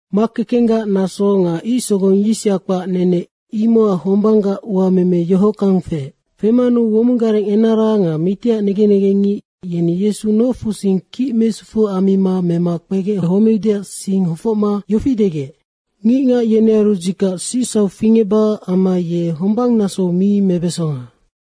Makekenggac naso nga ic sogong yisya kpac nene, imocac hombanggac uameme yohockang feec. Femanu womong gareng enara nga mitiac negen negengngic yeni Yesu nofusing kic mesufu ammima mema kpegec homeudeac sing hofocma yofi degec, “Ngicngac yenearu dzikac sicsauc fingecbacac amma ye hombang nasou mi mebesonga.”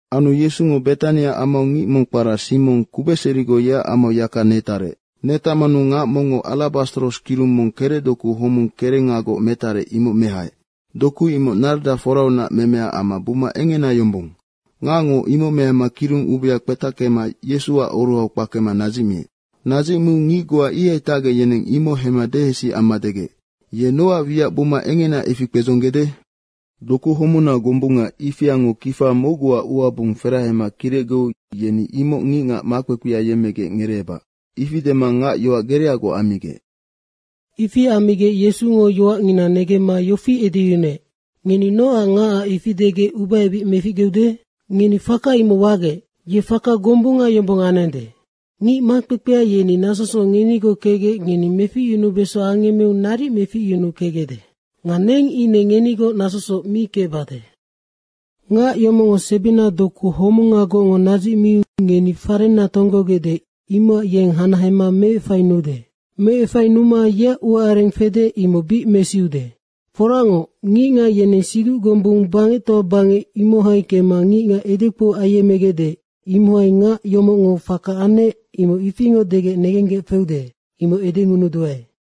Anu Yesungo Betania amau ngic mong kpara Simong kubecserigoc, yeac amau yaka netarec. Netacmanu ngac mongngo alabastros kirung mong kerecdoku homung kerengagoc metarec, imoc mehaec. Doku imoc narda foraunac memea amma buma engena yombong. Ngacngo imocnoc mehama kirung ubea kpetackema Yesuac oruhau kpakema nadzicmiec. Nadzicmiu ngic goa ihai tacgec, yeneng imoc hemma dehesi amma degec, “Ye nocac wiac buma engena ifi kpedzonggede? Doku homuna gombunga ifiango kifa mocguac uabung ferahema kirecgeu yeni imoc ngicngac makpekpea yemmegec ngereebac.” Ifi dema ngac yoac gereagoc ammigec. Ifi ammigec Yesungo yoacngina negemma yofi edeyunuec, “Ngeni nocac ngacac ifi degec ubaebic meficgeude? Ngeni faka imoc wagec. Ye faka gombunga yombong anende. Ngic makpekpea yeni nasosoc ngenigoc kecgec ngeni meficyunubeso angemmeu naric meficyunukecgecde. Nga neng ine ngenigoc nasosoc mi kecbade. Ngac yomocngo sebina doku homunagocngo nadzicmiu ngeni farenna tonggogecde, imocacnoc yeng hanahema meefainude. Meefainuma yeac uaareng fede, imoc bic mesiude. Foracngoc, ngicngac yeneng siduc gombung bangectoa bangec, imohai kemma ngicngac edekpou ayemmegecde, imohai ngac yomocngo faka anec, imoc ifingoc degec negenggec feude, imoc edengunuduae.”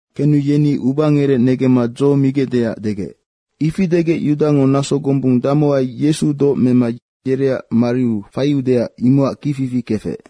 Kenu yeni ubangerec negemma dzo migecdeac degec. Ifi degec Yudango naso gombung damohai Yesu doc mema yereac mariu faiude, imocac kicfifi kefec.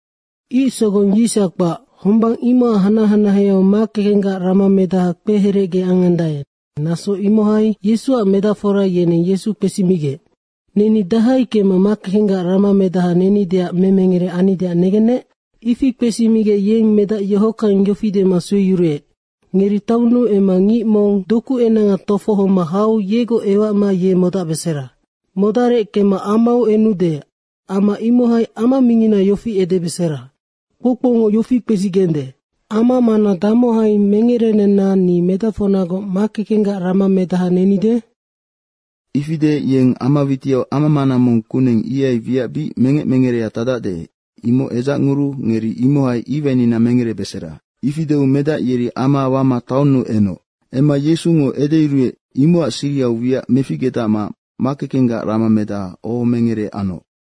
Ic sogong yis kpac, hombang imocac hanac hanaheau makekenggac ramamedaha kpeherecge angandae, naso imohai Yesuac medacfora yeneng Yesu kpesimigec, “Neni dahai kemma makekenggac ramamedaha nenideac memengere annideac negennec?” Ifi kpesimigec yeng medac yohockang yofi dema sueyuruec, “Ngeri taonnuu emma ngic mong dokuenanga tofohoma hau yegoc ewacma ye modacbesera. Modarec kemma amau enude, ama imohai ama mingina yofi edebesera, ‘Kpoukpoungo yofi kpesigende, “Ama mana damohai mengerenenna ni medacfocnagoc makekenggac ramamedaha nenide?” ’ Ifi deec yeng ama witiau amamana mong kuneng ihai wiac bic mengec mengerea tacdacde, imoc edzacnguruu ngeri imohai iwainina mengerebesera.” Ifi deu medac yeri ama wama taonnu enoc. Emma Yesungo edeyuruec, imocac sirihau wiac meficgedacma makekenggac ramamedaha ohomengere anoc.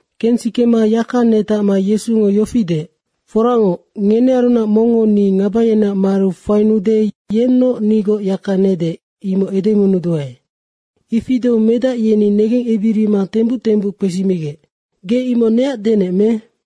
Kensikema yaka netacma Yesungo yofi deec, “Foracngoc, ngenearunac mongngo ni ngaba yeneac mariu fainuude, yennoc nigoc yaka nede, imoc edengunuduae.” Ifi deu medac yeni negengebirima tembuc tembuc kpesimigec, “Ge imoc neac denec me?”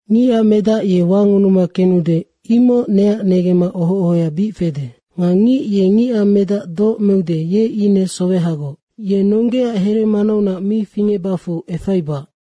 Ngicac Medac ye wangunuma kenude, imoc neac negemma oho ohoya bic fede. Nga ngic ye Ngicac Medac doc meude, ye ine sowehagoc. Ye nonggeaac here manaunac mi fingecbacfu efaibac.”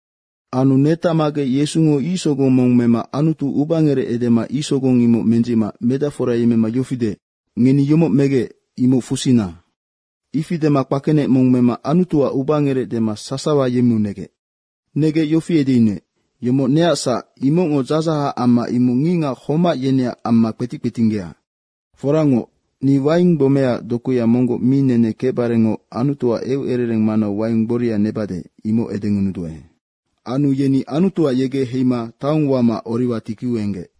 Anu netacmagec Yesungo ic sogong mong mema Anutu ubangerec edema ic sogong imoc mendzicma medacfora yemmema yofi deec, “Ngeni yomoc megec, imoc fusina.” Ifi dema kpakenec mong mema Anutuac ubangerec dema sasawa yemmeu negec. Negec yofi edeyunuec, “Yomoc neac sac, imocngo dzadzahac amma imoc ngicngac homac yeneac amma kpetic kpetinggea. Foracngoc, ni waing gbomeaac dokuya monggoc mi nene kecbarengoc Anutuac eucerereng manau waing gboria nebade, imoc edengunuduae.” Anu yeni Anutuac yegec heigec, Heima taong wama Oriwa tikiu enggec.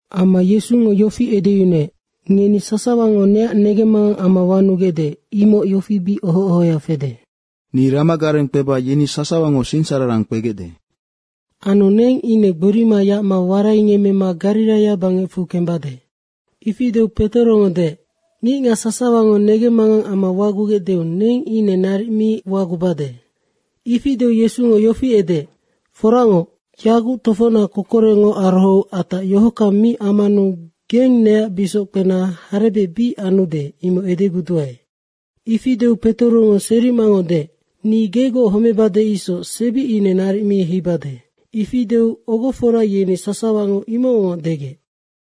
Emma Yesungo yofi edeyunuec, “Ngeni sasawango neac negemmangang amma wanugecde, imoc yofi bic oho ohoya fede. ‘Ni ramagareng kpeba yeni sasawango sinsararang kpegecde.’ Anu neng ine gborima yacma waraingemmema Gariraia bangecfu kembade.” Ifi deu Petorongo deec, “Ngicngac sasawango negemmangang amma wagugecdeu neng ine imoc naric mi ambade.” Ifi deu Yesungo yofi edeec, “Foracngoc, yaguc tofocnac kokorecngo arohou atac yohockang mi ammanu geng neac busickpena harebec bic anude, imoc edeguduae.” Ifi deu Petorongo serimangoc deec, “Ni gegoc homebade isoc sebi ine naric mi heibade.” Ifi deu ogofora yeni sasawango imocngoc degec.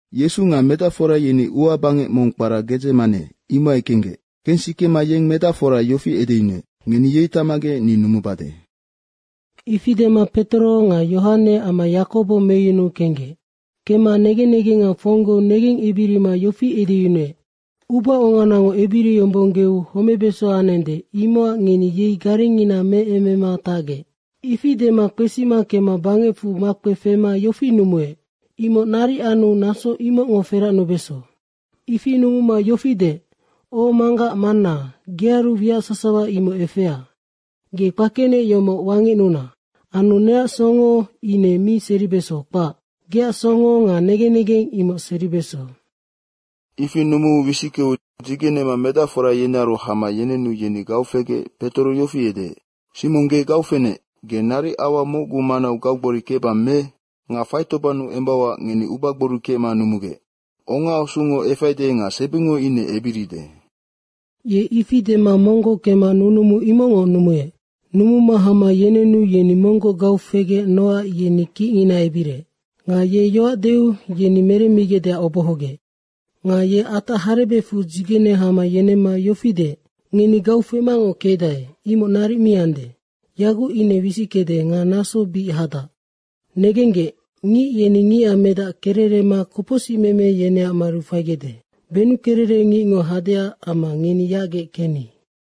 Yesu nga medacfora yeni ua bangec mong kpara Gedzemane, imohai kenggec. Kensikema yeng medacfora yofi edeyunuec, “Ngeni yei tacmagec ni numubade.” Ifi dema Petoro nga Yohane amma Yakobo meyunuu kenggec. Kemma negen negenga fonggou negengebirima yofi edeyunuec, “Ubaonganango ebiriyombonggeu homebeso anende, imocac ngeni yei garengngina meemema tacgec.” ifi dema kpesima kemma bangecfu makpefema yofi numuec, “Imoc naric anu naso imocngo feracnubeso.” ifi numuma yofi deec, “O Manggac manna, gearu wiac sasawa imoc efea. Ge kpakenec yomoc wangecnuna. Anu neac songo ine mi seribeso, kpac. Geac songo nga negen negeng imoc seribeso.” Ifi numuu wisickeu dzigenema medacfora yenearu hama yenenu yeni gau fegec Petoro yofi edeec, “Simong, ge gau fenec, ge naric aua mocguac manau gaugbori kecbang me? Nga faitobannu embauac ngeni ubagbori kecma numugec. Ongaasungo efaide nga sebingo ine ebiride.” Ye ifi dema monggoc kemma nunumu imocngoc numuec. Numuma hama yenenu yeni monggoc gau fegec. Nocac yeni kicngina ebiriec. Nga ye yoac deu yeni meremmigecdeac obohogec. Nga ye atac harebecfu dzigene hama yenemma yofi deec, “Ngeni gau femangoc kecdae, imoc naric mi ande. Yaguc ine wisickede nga naso bic hadac. Negenggec, ngic yeni Ngicac Medac kererema kopocsicmeme yeneac mariu faigecde. Benukererec ngicngo hadeac amma ngeni yacgec kenni!”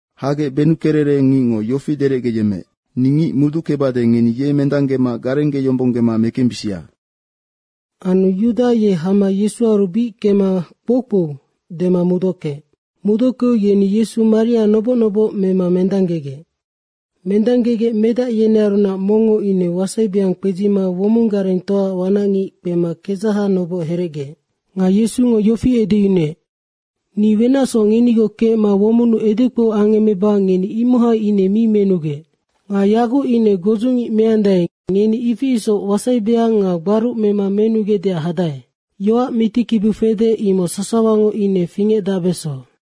Hagec benukererec ngicngo yofi derecgeyemmeec, “Ni ngic muduckebade, ngeni yenoc mendanggema garenggeyombonggema mekembisia.” Anu Yuda ye hama Yesuaru bic kemma, “Kpoukpou.” dema muduckeec. Muduckeu yeni Yesu maria noboc noboc mema mendanggegec. Mendanggegec medac yenearunac mongngo ine wasaibeang kpedzima womong garengtoaac wanacngic kpema kedzaha noboc herecgeec. Nga Yesungo yofi edeyunuec, “Ni wenacsoc ngenigoc kecma womonnu edekpou angemmeba ngeni imohai ine mi menugec. Nga yaguc ine godzungic meandae, ngeni ifi isoc wasaibeang nga gbaruc mema menugecdeac hadae.” Yoac mitikibiu fede, imoc sasawango ine fingecdacbeso.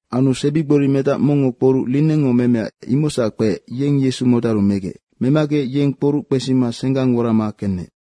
Anu sebigborimedac mongngo kporuc linengngo memea imocsac kpeec, yeng Yesu modaru megec. Memagec, yeng kporuc kpesima senggang worama kenec.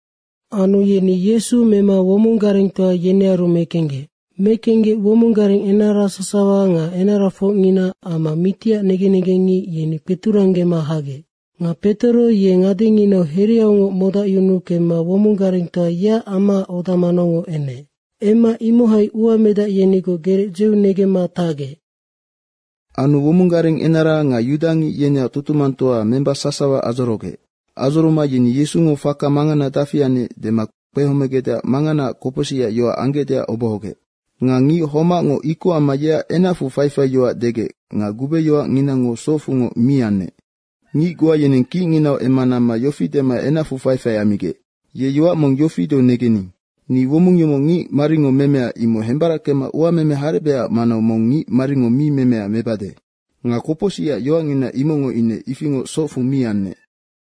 Anu yeni Yesu mema womong garengtoa yenearu mekenggec. Mekenggec womong gareng enara sasawa nga enarafocngina amma mitiac negen negengngic, yeni kpeturanggema hagec. Nga Petoro ye ngadenginau hereaungoc modacyunu kemma womong garengtoa yeac amaac oda manaungoc enec. Emma imohai uamedac yenigoc gerec dzeunegemma tarec. Anu womong gareng enara nga yudangic yeneac tutumangtoa memba sasawa adzorogec. Adzoroma yeni Yesungo faka mangana dafi anec dema kpehomegecdeac manganaac kopocsicac yoac anggecdeac obohogec. Nga ngic homacngo ikoc amma yeac enacfu faifaiyoac degec nga gubeyoacnginango socfungoc mi anec. Ngic goa yeneng kicnginau emma namma yofi dema enacfu faifai ammigec, “Ye yoac mong yofi deu negening, ‘Ni womong yomoc ngicmaringo memea, imoc hembarackema uameme harebecac manau mong ngicmaringo mi memea mebade.’” Nga kopocsicac yoacngina imocngo ine ifingoc socfu mi anec.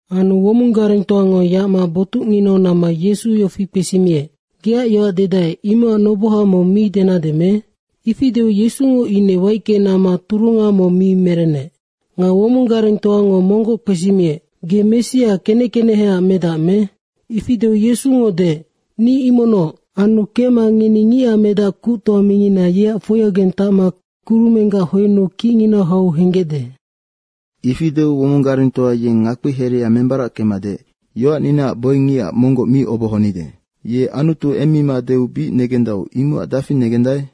Anu womong garengtoango yacma botucnginau namma Yesu yofi kpesimiec, “Geac yoac dedae, imocac noboha mong mi denade me?” Ifi deu Yesungo ine waicke namma turunga mong mi merennec. Nga womong garengtoango monggoc kpesimiec, “Ge Messia, Kenec keneheac medac me?” Ifi deu Yesungo deec, “Ni imocnoc. Anu kecma ngeni Ngicac Medac Kuctoa mingina yeac foiaugeng tacma kurumenggac hoennu kicnginau hau henggecde.” Ifi deu womong garengtoa yeng ngakpihereha membarackema deec, “Yoacninaac boingicac monggoc mi obohonide. Ye Anutu emmima deu bic negendau, imocac dafi negendae?”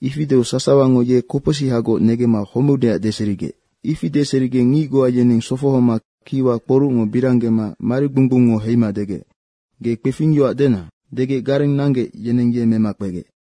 Ifi deu sasawango ye kopocsihagoc negemma homeudeac deserigec. Ifi deserigec ngic goa yeneng sofohoma kiwa kporucngo biranggema marigbung gbungngo heima degec, “Ge kpefingyoac dena!” degec gareng nanggec, yeneng ye mema kpegec.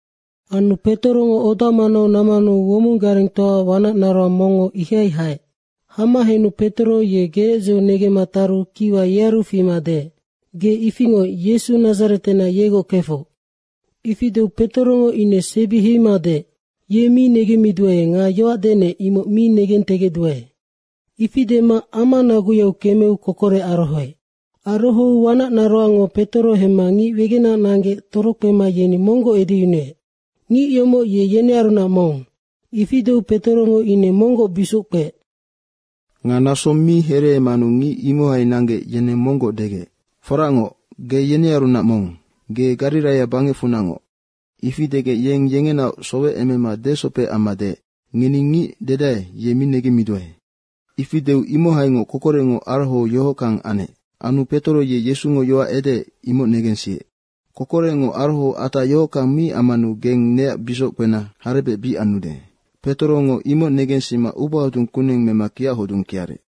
Anu Petorongo oda manau nammanu womong garengtoaac wanac naroang mongngo ihai haec. Hama henu Petoro ye gerec dzeunegemma taru kiwa yearu fima deec, “Ge ifingoc Yesu Nadzaretenac, yegoc kefoc.” Ifi deu Petorongo ine sebi heima deec, “Ye mi negemmiduae nga yoac denec, imoc mi negentegecduae.” Ifi dema ama naguyau kemeu kokorec arohoec. Arohou wanac naroangngo Petoro hemma ngic wegenac nanggec, torokpema yeni monggoc edeyunuec, “Ngic yomoc ye yenearunac mong.” Ifi deu Petorongo ine monggoc busickpeec. Nga naso mi hereemanu ngic imohai nanggec, yeneng monggoc degec, “Foracngoc, ge yenearunac mong. Ge Gariraia bangecfunacngoc.” Ifi degec ye yengenaoc sowecemema desopec amma deec, “Ngeni ngic dedae, ye mi negemmiduae.” Ifi deu imohaingoc kokorecngo arohou yohockang anec. Anu Petoro ye Yesungo yoac edeec, imoc negensiec, “Kokorecngo arohou atac yohockang mi ammanu geng neac busickpena harebec bic anude.” Petorongo imoc negensima ubahodung kuneng mema kiachodung kiarec.